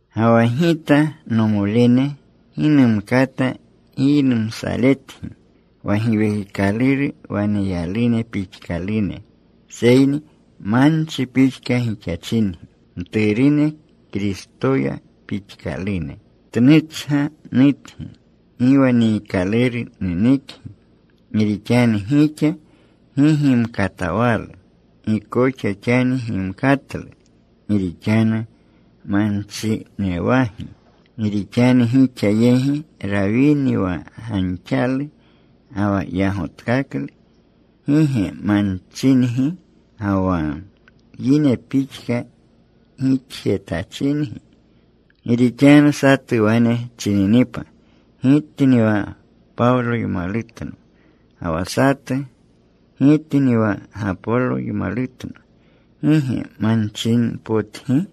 Ga wa gita, nomolene, gi numkata giynumsaletgi wa Giwekikaluru waneyalune pixkalune, seyni manchi pixka gixachingi, mturune Kristoya pixkalune. Tnuchga nutgi. Gi wa niikaluru nenekgi. Gi rixanu gixa gi gimkatawalu. Gi koxa xani gimkatlu. Gi rixanu manchinewagi. Gi rixanu gixa yegi rawini wa ganxalu ga wa yagotkaklu, ¿gi ge manchingi, ga wa yine pixka gixjetachingi? Gi rixanu satu wane chininipa, “Gitni wa Pawloymalutno,” ga wa satu, “Gitni wa Gapoloymalutno,” ¿gi ge manchinenpotgi?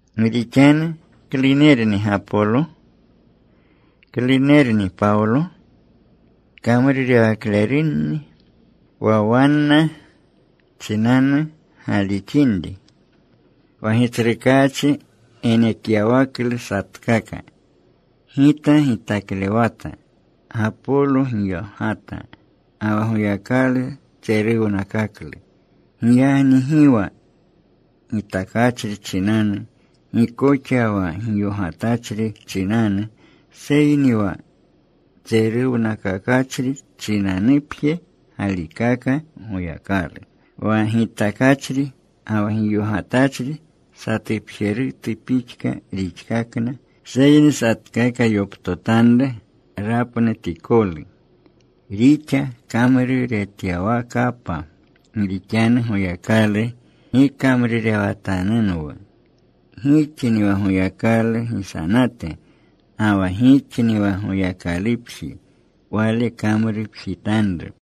Gi rixanu ¿klunerni Gapolo? ¿klunerni Pawlo? Kamrurewaklerunni, wa wanna chinanu galixinri, wa Gitsrukaachi genekyawaklu satkaka. Gita gitaklewata. Gapolo giyogata. Ga wa Goyakalu tseruwnakaklu. Giyagni gi wa gitakachri chinanu, gi koxa wa giyogatachri chinanu, seyni wa tseruwnakakachri chinanupje galikaka Goyakalu. Wa gitakachri ga wa giyogatachri satupjerutu pixka rixkakna. Seyni satkaka yoptotanru rapnutikolu rixa kamruretyawakapa. Gi rixanu Goyakalu gikamrurewatanunwu. Gixni wa Goyakalu gisanate, ga wa gixni wa Goyakalupji Wale kamrupjitanru.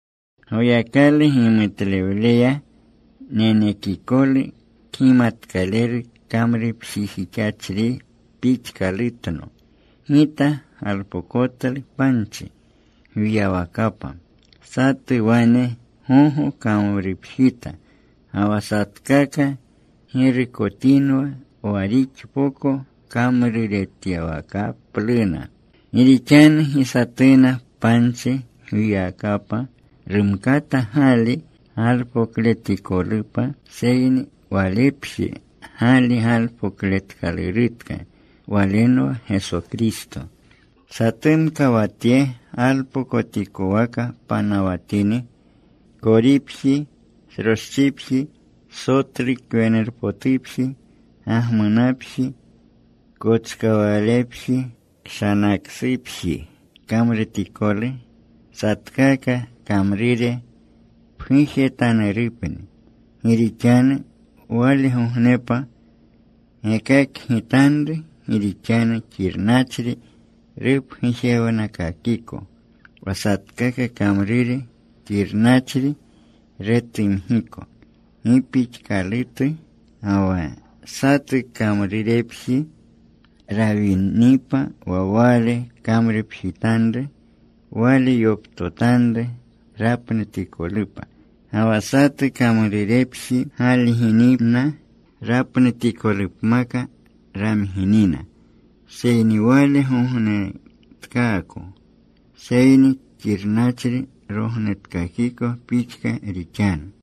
Goyakalu gimutlewleya nenekikolu kgimatkaleru kamrupjijixachri pixkalutno, gita galpokotlu panchi gwiyawakapa. Satu wane gogo kamrupjita. Ga wa satkaka girukotinwa wa rixpoko kamruretyawakapluna. Gi rixanu gi satuna panchi gwiyawakapa rumkata gali pokletikolupa, seyni walepje gali galpokletkalurutka. Walenwa Geso Kristo. Satumka wa tye galpokotikowaka panawatini, koripji, sroschipji, sotlu kwenurpotupji, gagmunapji, kochkawalepji, kshanaksupji kamrutikolu, satkaka kamrure pgujetanurupni. Gi rixanu walegognepa gekakgitanru. Gi rixanu xirnachri rupgujewnakakiko. Wa satkaka kamrure xirnachri retumgiko gi pixkaktalu. Ga wa satu kamrurepji rawinipa wa wale kamrupjitanru, wale yoptotanru rapnutikolupa. Ga wa satu kamrurepji galginina, rapnutikolupmaka ramginina, seyni wale gognetkaako. Seyni xirnachri rognetkakiko pixka rixanu.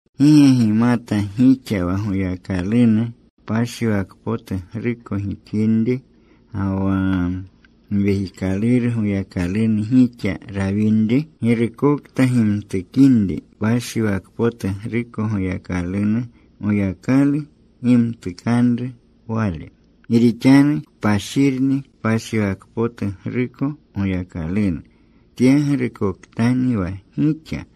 ¿Gi ge gimata gixa wa Goyakalunu kpashiwakpotugruko gixinri ga wa Giwekikaluru Goyakalunu gixa rawinri? Girukokta gimtukinri kpashiwakpotugruko Goyakalunu, Goyakalu gimtukanru wale. Gi rixanu kpashirni kpashiwakpotugruko Goyakalunu. Tyeyegrukotkani wa gixa.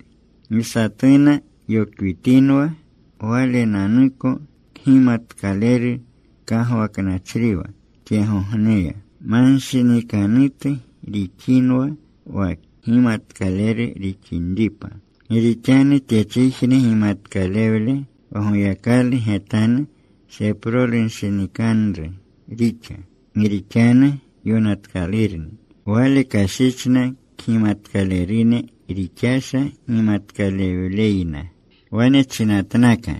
Gi satuna yokwitinwa. Walenanuko kgimatkaleru kagwaknachriwa tyegogneya, manshinikanutu rixinwa wa kgimatkaleru rixinripa. Gi rixanu tyechijne gimatkalewle wa Goyakalu getanu seprolunshinikanru rixa. Gi rixanu yonatkalurni: Wale kashichna kgimatkalerune rixasha gimatkalewleyna. Wane chinatnaka: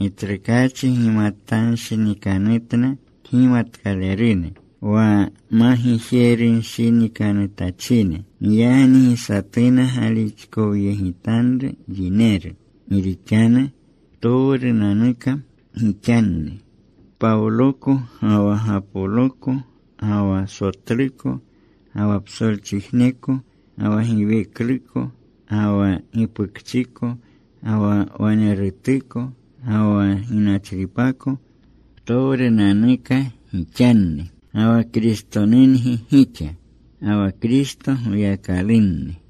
Gitsrukaachi gimatanshinikanutna kgimatkalerune, wa magijerunshinikanutachine. Giyagni gi satuna galixkowyegitanru yineru. Gi rixanu ptowrunanuka gixanni. Pawloko, ga wa Gapoloko, ga wa Sotluko, ga wa psolchijneko, ga wa giwekluko, ga wa gipukchiko, ga wa wanerutuko, ga wa ginachripako, ptowrunanuka gixanni. Ga wa Kristonungi gixa. Ga wa Kristo Goyakalunni.